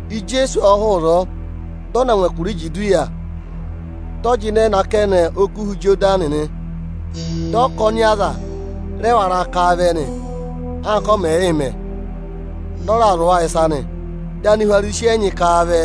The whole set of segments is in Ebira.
Ijeesu ộ hụụ ịzọọ, dị ọ na ngụ ẹkụra Ijudiya, dị ọ jịnẹ nọ akẹnẹ Okuha Ịjọdanị nị. Dị ọkọnị aza rẹ wara ká a vẹ nị. Anka ọ mẹ̀ yị mẹ, dị ọ raa zụ̀ wa ịsa nị. Dị Anihwarisi ẹnyị ká a vẹ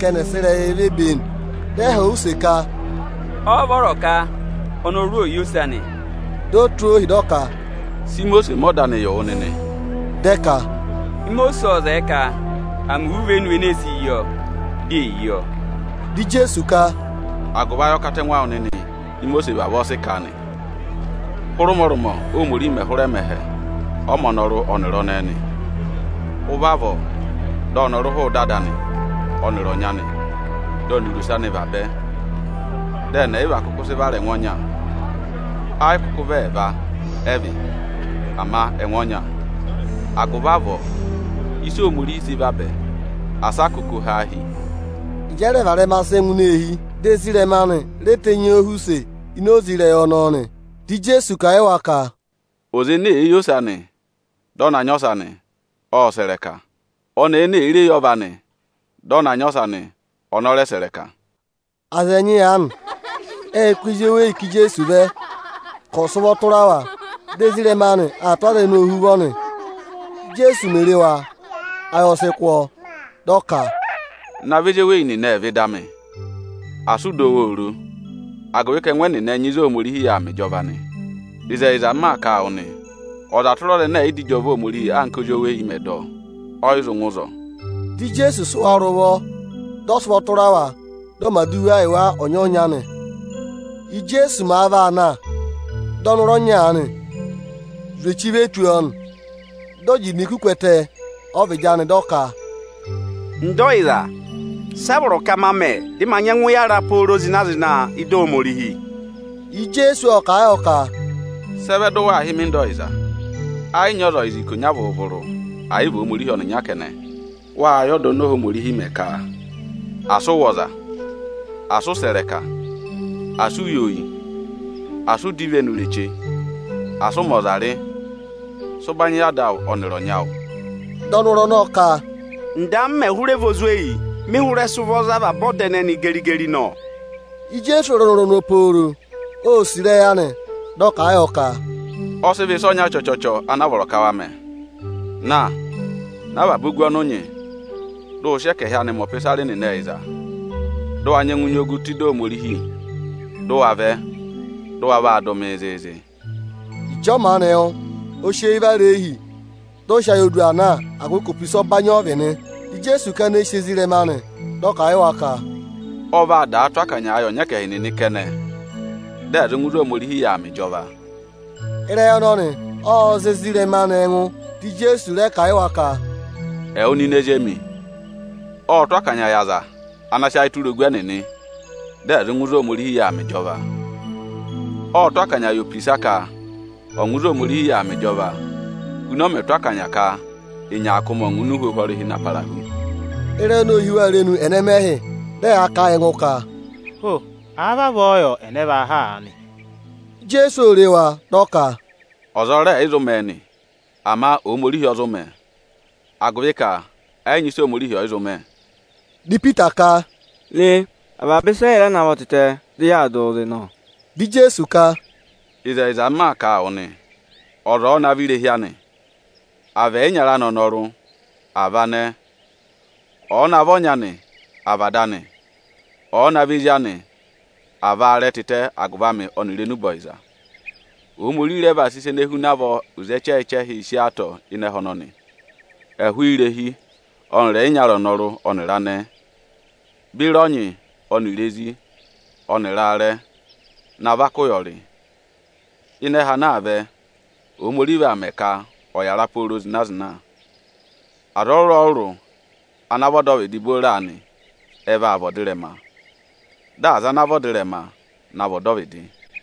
ka ẹnị ẹ̀ sị ịrẹyị ve be e nị. Dị ẹ họ̀ ọ use ka, “Ọ́ọ́ vọrọ ka ọnọrụ ò yi ose anị?” Di o tụ́ ohi, dị ọ ka, “Sị Imosiisi mẹ ọda anị yị wụ nịnị?” Dị ẹ ka, “Imosiisi ộ zẹẹ ka à mẹ iwe ivenu enee si yi ọọ, di è yi ọọ.” Dị Ijeesu ka, “Agụvị ayọkatẹngụ awụ nịnị Ímosiisi vavọọ sị kà a nị. Hụrẹ ụmọrụmọ Óhomorihi mẹ̀ hụrẹ mẹ ẹhẹ, ọ mẹ ọnọrụ ọnịrị ọnẹẹ nị. Ụvị avọọ dị ọnọrụ hụụ ịda ada anị ọnịrị ọnyị anị, dị ọnịrị ose anị vabẹ. Dị ẹnị ẹyịva kụkụ sị vara ẹngụ ọnya. Ẹ yị kụkụ vị ẹẹva ẹ vị, ama ẹngụ ọnya. Agụvị avọọ ịsị Ohomorihi sị vabẹ, asị a kụkụ ha a hi!” Ịjị ẹ rẹ varẹma sị ngụ ini eehi, dị ezirẹma anị re tenyi ọọ họ̀ use ini oze ịrẹyị ọnọọ nị. Dị Ijeesu kà a yị wa ka: Ịkọ 7.10,11“Ọza ene èe yi ose anị, dị ọ na nyị ọsa nị, ộ sẹ̀ ịrẹka. Ọnẹẹ ene èe re yi ọva anị, dị ọ na va ọsa nị, ọnị ọ rẹ sẹ̀ ịrẹka.” Aza (ẹnyị aanị) ệ kụ́ ezi eweyi ká Ijeesu vẹ ka ọ̀ sị ụvọ tụra wa. Dị ezirẹma anị aa tụ́ aza ẹnẹẹ ohuvọ nị. Íjeesu mè re wa, ayị ọ sị kụ́ ọọ. Dị ọ ka, “Navọ ezi eweyi nịnị ẹ̀ vẹ ịda amị! Asị ụ dọ wa oro, agụvị ka ẹngụ ẹnẹnị ẹ nyị ịzị Ohomorihi yà aa mẹ ịjọva nị. Ịzẹyịza, m maa kà a wụ nịnị nị, ọza tụra ọza ẹnẹ ẹ̀ yị dọ ịjọva Ohomorihi anka ózi oweyi mẹ̀ẹ̄ dọ, ọ yị zụ ngụ ịzọọ.” Dị Ijeesu sị wa rị ụvọ, dị ọ sị ụvọ tụra wa, dị ọ mẹ̀ aduwa yị wa ọnya-ọnya nị. Íjeesu màa vaa na, dị ọnọrụ ọnya aanị zwe echi ve tù ọọ nị. Dị ọ jị idinku ku ẹtẹ ọ́vịdị anị, dị ọ ka, “Nda ọyịza, sị a vọrọ ka ma mẹ, dị ma nyẹngụ yàra pooro zịna-zịna ị́dị Ohomorihi?” Ijeesu ộ kà a yọ ka, “Sị ẹ vẹ dị ụ waa hị́ mị Nda ọyịza? Ẹ yị nyị ọza ọyịza ikonya vụrụ-vụrụ, ẹ̀ yị vị Ohomorihi ọnịnya kẹnẹ. Wâ yẹ ọda oni Ohomorihi mẹ ka: Asị ụ wụ̀ ọza; Asị ụ sẹ̀ ịrẹka; Asị ụ yi oyi; Asị u dọ ivenu ireche; Asị ụ mẹ ọza rị. Sị ụbanyị yị ada awụ ọnịrị ọnyị awụ.” Dị ọnọrụ ọnọọ ka, “Nda, mmẹ hụrẹ vị ozweyi, mị hụrẹ sị ụvọ za avaba ọda ẹnẹnị geri-geri nọ!” Ijeesu ô re ọnọrụ ọnọọ pooro, ô sì ịrẹyị anị, dị ọ kà a yọ ka, “Ọ sị vọ ịsa ọnya chọchọchọ ana a vọrọ ka wa mẹ: Na, ná avaba ogu ọnị ụ nyị, dị ụ wa sị ẹkẹhị anị mẹ ọpịsarị nịnị ẹyịza, dị ụ wa nyẹngụ nyị ogu tụ́ ịdị Ohomorihi, dị ụ wa vẹ, dị ụ wa vaa dụ mịị zịịzị!” Ịjị ọ maanị wụ́, o si eyi vara ịhị, dị ọ sị ayị oyidu aa na, agụvị ka opisa ọbanyị ọ vị nị. Dị Ijeesu kana eyi sì ezirẹma anị, dị ọ kà a yị wa ka, “Ọ vaa daa tụ́ akanyaa yị ọnyẹkẹhị nịnị kẹnẹ, dị ẹ̀ zụ ngụ ịzị Ohomorihi yà aa mẹ ịjọva.” Ịrẹyị ọnọnị ộ za ezirẹma anị ẹngụ. Dị Ijeesu rẹ kà a yị wa ka, “Ẹwụ nịnị ezi emi, ộ tụ́ akanya yị aza (ana sị ayị tụra ogu ẹnịnị), dị ẹ̀ zụ ngụ ịzị Ohomorihi yà aa mẹ ịjọva. Ộ tụ́ akanya yị opisa ka ọ̀ ngụ ịzị Ohomorihi yà aa mẹ ịjọva, huna ọ mẹ̀ tụ́ akanya ka ịnyaakụmị ọ̀ ngụ ini uhwohwo ọrịhị na para hu.” Ịrẹyị ọnọọ ô hí wa irenu ẹnẹmẹhị, dị ẹyaa kà a yị ẹngụ ka, “Ho! Àa vavọọ yọ, ẹnẹ vaa há aanị?” Ijeesu ô re wa, dị ọ kà, “Ọza ọ rẹ ẹ̀ yị zụ mẹ̀ ẹ nị, ama Ohomorihi ọ zụ mẹ̀ ẹ, agụvị ka ẹ yị nyị ịsị Ohomorihi ọ̀ yị zụ mẹ.” Dị Ipita ka, “Re, avaba ịsa ẹ́ yị navọ tịtẹ, dị yaa dụ wụ zị nọ.” Dị Ijeesu ka, “Ịzẹyịza, m maa kà a wụ nị, ọza ọ̀ọ navọ irehi anị, àa vị ẹyịnyara anị ọnọrụ, àa vị anẹẹ, ọ̀ọ navọ ọnyị anị, àa vị ada anị, ọ̀ọ navọ ezi anị, àa vị aarẹ tịtẹ agụvị amị ọnịrị agụvị enube ọyịza, Ohomorihi rẹ vaa sị ịsa ene huna avọọ oze ẹchẹhị-ẹchẹhị sí ọọ atọ ịnị ẹhẹ ọnọnị, ẹhụụ irehi ọnịrị ẹyịnyara ọnọrụ ọnịrị anẹẹ, beri ọnyị ọnịrị ezi ọnịrị aarẹ, na vaka ụyọrị; ịnị ẹhẹ ana aa vẹ, Ohomorihi vaa mẹ ka ọ̀ yàra pooro zịna-zịna. Aza ọrụrụ-ọrụrụ ana vị ọdọvịdị booro aanị, ẹ vaa vị ọdịrẹma; dị aza ana vị ọdịrẹma, na vị ọdọvịdị.”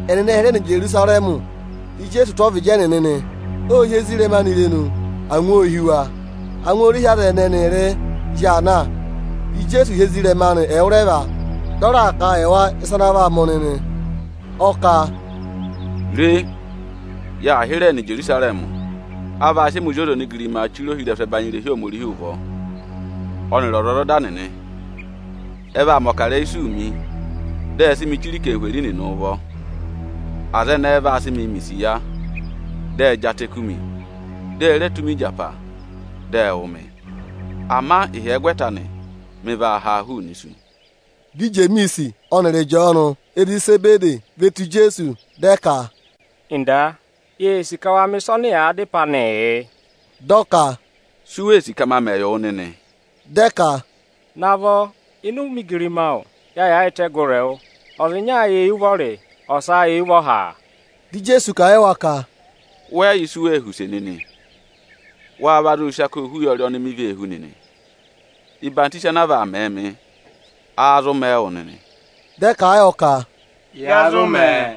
Ẹnịnị ệ hịrẹ nọ Ijerusarẹmị, dị Ijeesu tụ́ ọvịdị ẹnịnị nị. Ô hí ezirẹma anị irenu, angwa ô hí wa. Angwa o re hí aza ẹnị ẹnịrịị zị aa na. Dị Ijeesu hị́ ezirẹma anị ẹwụrẹva, dị ọ raa kà a yị wa ịsa ana vaa mẹ̀ ọnị nị. Ọ kà, “Re! Yaa hịrẹẹ nọ Ijerusarẹmị. A vaa sị ẹmị Ozi ọza onigirimaa chire ohirẹsụ ẹbanyị irehi Ohomorihi ụvọ, ọnịrị ọzwọzọda nịnị. Ẹ vaa mẹ̀ ọkarẹyị isuu mị, dị ẹ sị mị chire aza ẹnẹ ẹ̀ yị vị aniju nịnị ụvọ. Aza ẹnẹẹ vaa sị mịị mẹ̀ isiya, dị ẹ jị atẹ kú mi, di e re tụ́ mi ịjapa, dị ẹ wụ̀ mị. Ama ịhyẹgwẹta anị mị vaa ha hụụnị isu.” Dị Ijemiisi ọnịrị Ịjọọnụ, ezi Isebede, ve tù Ijeesu, dị ẹ ka, “Nda, yee sì ka wa mẹ̀ ịsa ọnị yàa dá ịpẹ anịị yị.” Dị ọ ka, “Si u wee sì ka ma mẹ yị wụ nịnị?” Dị ẹ ka, “Navọ, ịnị ụmẹ igirima awụ, ya yaayịtẹ gụrị ẹwụ, ọza ịnya ayị éyi ụvọrị, ọsa éyi ụvọha!” Dị Ijeesu kà a yị wa ka, “Wẹ yị yẹ ịsị u wee họ̀ use anị nịnị. Wáá va zụụ sị akoo hú ụyọrị oni mi vee hú nịnị? Ọyịhwọzenyi anaa vaa mẹẹ mị, wáá vaa dọ ka a mẹ̀ ẹ wụ nịnị?” Dị ẹ kà a yọ ka, “Ya zụ mẹ̀ ẹ.”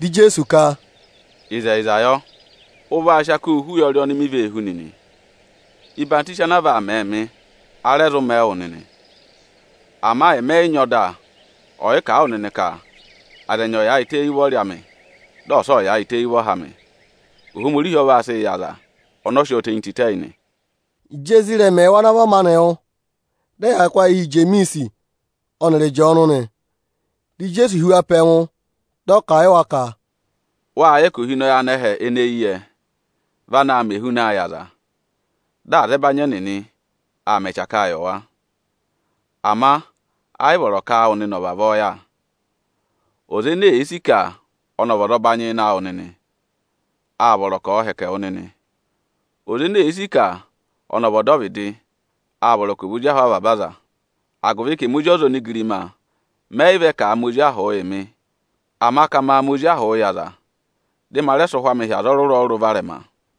Dị Ijeesu ka, “Ịzẹyịza yọ, ụ vaa sị ako hú ụyọrị oni mi vee hú nịnị. Ọyịhwọzenyi anaa vaa mẹẹ mị, a rẹ vaa mẹẹ wụ nịnị. Ama ẹmị ẹ yị nyị ọda ọyịkà a wụ nịnị ka aza ẹnyị ọ̀ yaayịtẹ éyi ụvọrị amị, dị ọsa ọ̀ yaayịtẹ éyi ụvọha amị. Ohomorihi ọ vaa sịị yị aza ọnọọ sị ọọ tenyi tịtẹ yị nị.” Ịjị ezirẹma ẹẹwụ ana vọ maanị wụ́, dị ẹyaa kụ́ ayị hi Ijemiisi ọnịrị Ịjọọnụ nị. Dị Ijeesu hị́ wa pe ẹngụ, dị ọ kà a yị wa ka, “Wâ yẹ ka ohinọyị anẹhẹ ene eyi yẹ vị anaā mẹ ehunaa yị aza, dị azẹbanyị ẹnịnị aa mẹ ẹchakaa yị wa. Ama ẹ yị vọrọ ka áawụ nịnị ọ̀ vavọọ yà. Ọza ene èe sì ka ọnị ọ̀ nyị ụbanyị ịnị awụ nịnị, â vọrọ ka ọ̀ọ hẹkẹ wụ nịnị. Ọza ene èe sì ka ọnị ọ̀ vị ọdọvịdị, â vọrọ ka ọ̀ vị ozi ahụ avaba aza; agụvị ka emi Ozi ọza onigirima ẹ yị vẹ ka à mẹ ozi ahụ yị mị, ama ka ma mẹ ozi ahụ yị aza, dị ma rẹ sị ụhwẹ amị hị́ aza ọrụrụ-ọrụrụ varẹma.”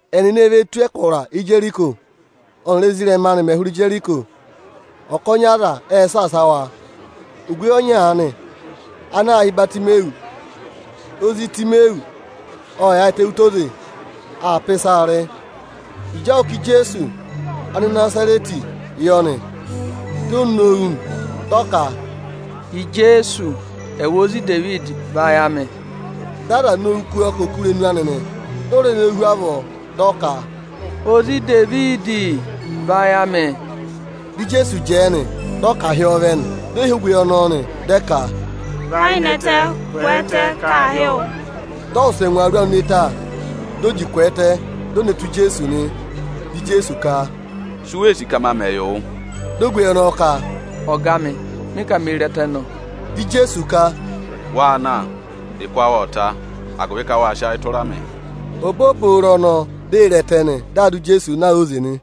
Ẹnịnị e ve tù ẹkụra Ijeriko. Ọ́nịrị ezirẹma anị mẹ̀ hụrẹ Ijeriko, ọkọnị aza ệ saasa wa. Ogweyi ọnya aanị ana aā hị́ Ibatimeyọsị, ozi Itimeyọsị, ộ yaayịtẹ ụtọ oze, aa pà ịsaa rị. Ịjị ọ wụ́ ka Ijeesu Anịnazarẹtị yọ nị, di ee nowu nị, dị ọ ka, “Ijeesu! Ẹwụ ozi Idevidi, vayị amị!” Dị aza nowu kú ọọ ka ò kú irenu anị nị. Di o re nowu hu avọọ, dị ọ ka, “Ozi Idevidi, vayị amị de!” Dị Ijeesu jẹẹ nị, dị ọ ka à hị́ ọọ vẹ nị. Ệ hị́ ogweyi ọnọọ, dị ẹ ka, “Và ayị nẹtẹ, kwẹẹtẹ, ka aa hị́ wụ!” Dị ọ wụsẹ ngwa awuru anị ne ta, di o ji kwẹẹtẹ, di o ne tù Ijeesu nị. Dị Ijeesu ka, “Si u wee sì ka ma mẹ yị wụ?” Di ogweyi ọnọọ ka, “Ọga amị, mị ka mee re ẹtẹ nọ.” Dị Ijeesu ka, “Waa na, ụkụ awụ ộ ta, agụvị ka wâ sị ayị tụra mị.” Obooboro ọnọọ di ee re ẹtẹ nị. Dị aa dụ Ijeesu na óze nị.